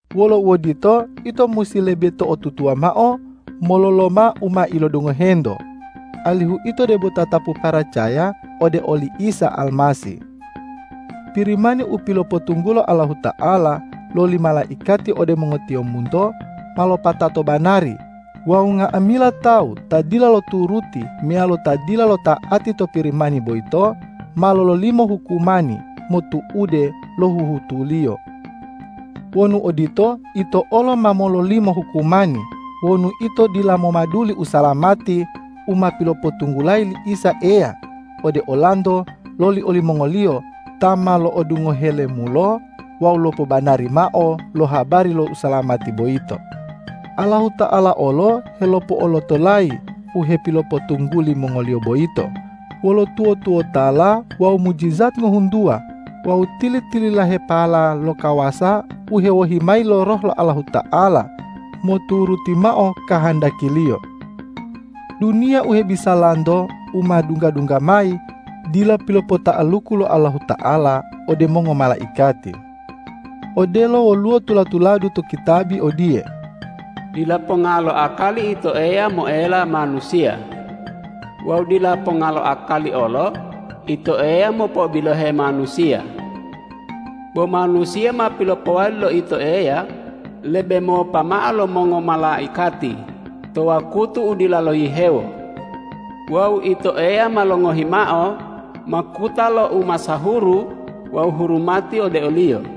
Wolo uodito, ito musi lebe to'otutuwa mao mololoma u ma ilodungohento, alihu ito debo tatapu paracaya ode oli Isa Almasih. Pirimani u pilopotunggulo Allahuta'ala loli malaikati ode mongotiyombunto ma lopatato banari wawu nga'amila tawu ta dila loturuti meyalo ta dila lota'ati to Pirimani boyito, ma lololimo hukumani motu'ude lo huhutuliyo. Wonu odito, ito olo ma mololimo hukumani wonu ito dila momaduli usalamati u ma pilopotunggulayi li Isa Eya ode olanto loli olimongoliyo ta ma lo'odungohe lemulo wawu lopobanari mao lo habari lo usalamati boyito. Allahuta'ala olo helopo'olotolayi u hepilopotungguli mongoliyo boyito wolo tuwo-tuwotala wawu mujijat ngohuntuwa wawu tili-tililahepala lo kawasa u hewohi mayi lo Roh lo Allahuta'ala moturuti mao kahandaki-Liyo. Duniya u hebisalanto u ma dungga-dungga mayi dila pilopota'aluku lo Allahuta'ala ode mongomalaikati. Odelo woluwo tula-tuladu to kitabi odiye,”Dila ponga lo akali Ito Eya moela manusiya. Wawu dila ponga lo akali olo Ito Eya mopo'obilohe manusiya. Bo manusiya ma pilopowali lo Ito Eya lebe mopa mao lo mongomalaikati to wakutu u dila lohihewo. Wawu Ito Eya ma longohi mao makuta lo umasahuru wawu hurumati ode oliyo.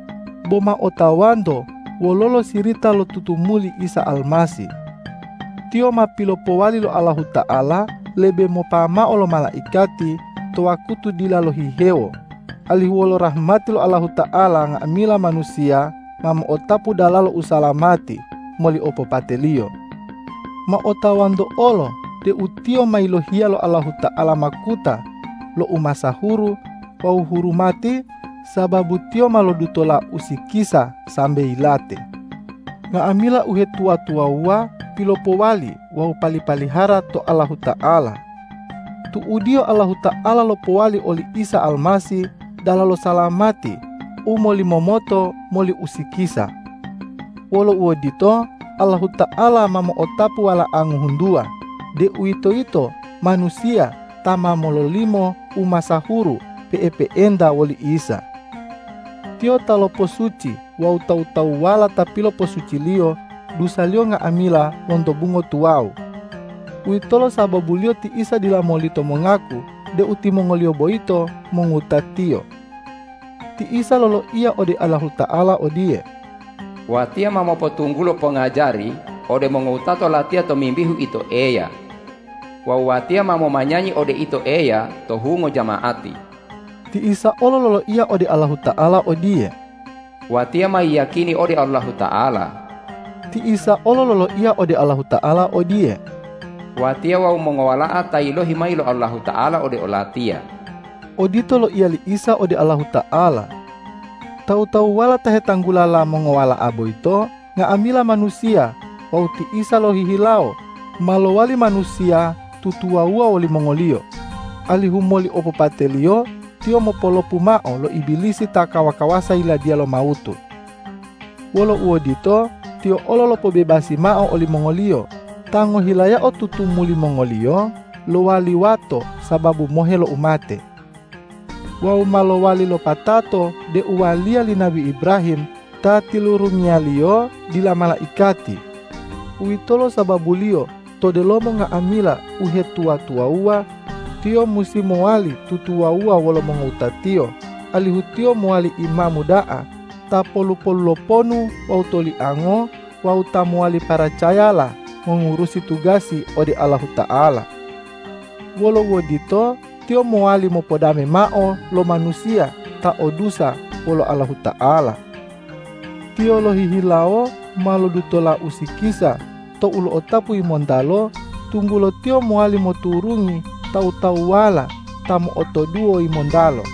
Bo ma otawanto wololo sirita lo tutumuli Isa Almasih! Tiyo ma pilopowali lo Allahuta'ala lebe mopa mao lo malaikati to wakutu dila lohihewo, alihu wolo rahmati lo Allahuta'ala nga'amila manusiya ma mo'otapu dalalo usalamati moli opopate-Liyo. Ma otawanto olo deu Tiyo ma yilohiya lo Allahuta'ala makuta lo umasahuru wawu hurumati, sababu Tiyo ma lodutola usikisa sambe yilate. Nga'amila uhetuwa-tuwawuwa pilopowali wawu pali-palihara to Allahuta'ala. Tu'udiyo Allahuta'ala lopowali oli Isa Almasih dalalo salamati u molimomoto moli usikisa. Wolo uodito, Allahuta'ala ma mo'otapu wala'a ngohuntuwa, deuwitoyito manusiya ta ma mololimo umasahuru pe'epe'enta woli Isa. Tiyo ta loposuci wawu tawu-tawuwala ta piloposuci-Liyo dusaliyo nga'amila lonto bungo tuwawu. Uwitolo sababuliyo ti Isa dila molito mongaku deu timongoliyo boyito mongowuta-Tiyo. Ti Isa loloiya ode Allahuta'ala odiye,”Watiya ma mopotunggulo pongajari ode mongowutato Latiya tomimbihu Ito Eya. Wawu Watiya ma momanyanyi ode Ito Eya to hungo jama'ati.” Ti Isa olo loloiya ode Allahuta'ala odiye,”Watiya ma yiyakini ode Allahuta'ala.” Ti Isa olo loloiya ode Allahuta'ala odiye,”Watiya wawu mongowala'a ta yilohi mayi lo Allahuta'ala ode o-Latiya.” Odito loiya li Isa ode Allahuta'ala. Tawu-tawuwala ta hetanggulala mongowala'a boyito nga'amila manusiya wawu ti Isa lohihilawo ma lowali manusiya tutuwawuwa wolimongoliyo, alihu moli opopate-Liyo Tiyo mopolopu mao lo Ibilisi ta kawa-kawasa yiladiya lo mawutu. Wolo uodito, Tiyo olo lopobebasi mao olimongoliyo ta ngohilayao tutumuli mongoliyo lowali wato sababu mohe lo umate. Wawu ma lowali lopatato deu waliya li nabi Ibrahim ta tilurungiya-Liyo, dila malaikati. Uwitolo sababuliyo to delomo nga'amila uhetuwa-tuwawuwa, Tiyo musi mowali tutuwawuwa wolo mongowuta-Tiyo, alihu Tiyo mowali Imamu da'a ta polu-polu lo ponu wawu toliango wawu ta mowali paracayala mongurusi tugasi ode Allahuta'ala. Wolo uodito, Tiyo mowali mopodame mao lo manusiya ta o dusa wolo Allahuta'ala. Tiyo lohihilawo ma lodutola usikisa tou lo'otapu yimontalo, tunggulo Tiyo mowali moturungi tawu-tawuwala ta mo'otoduwo yimontalo.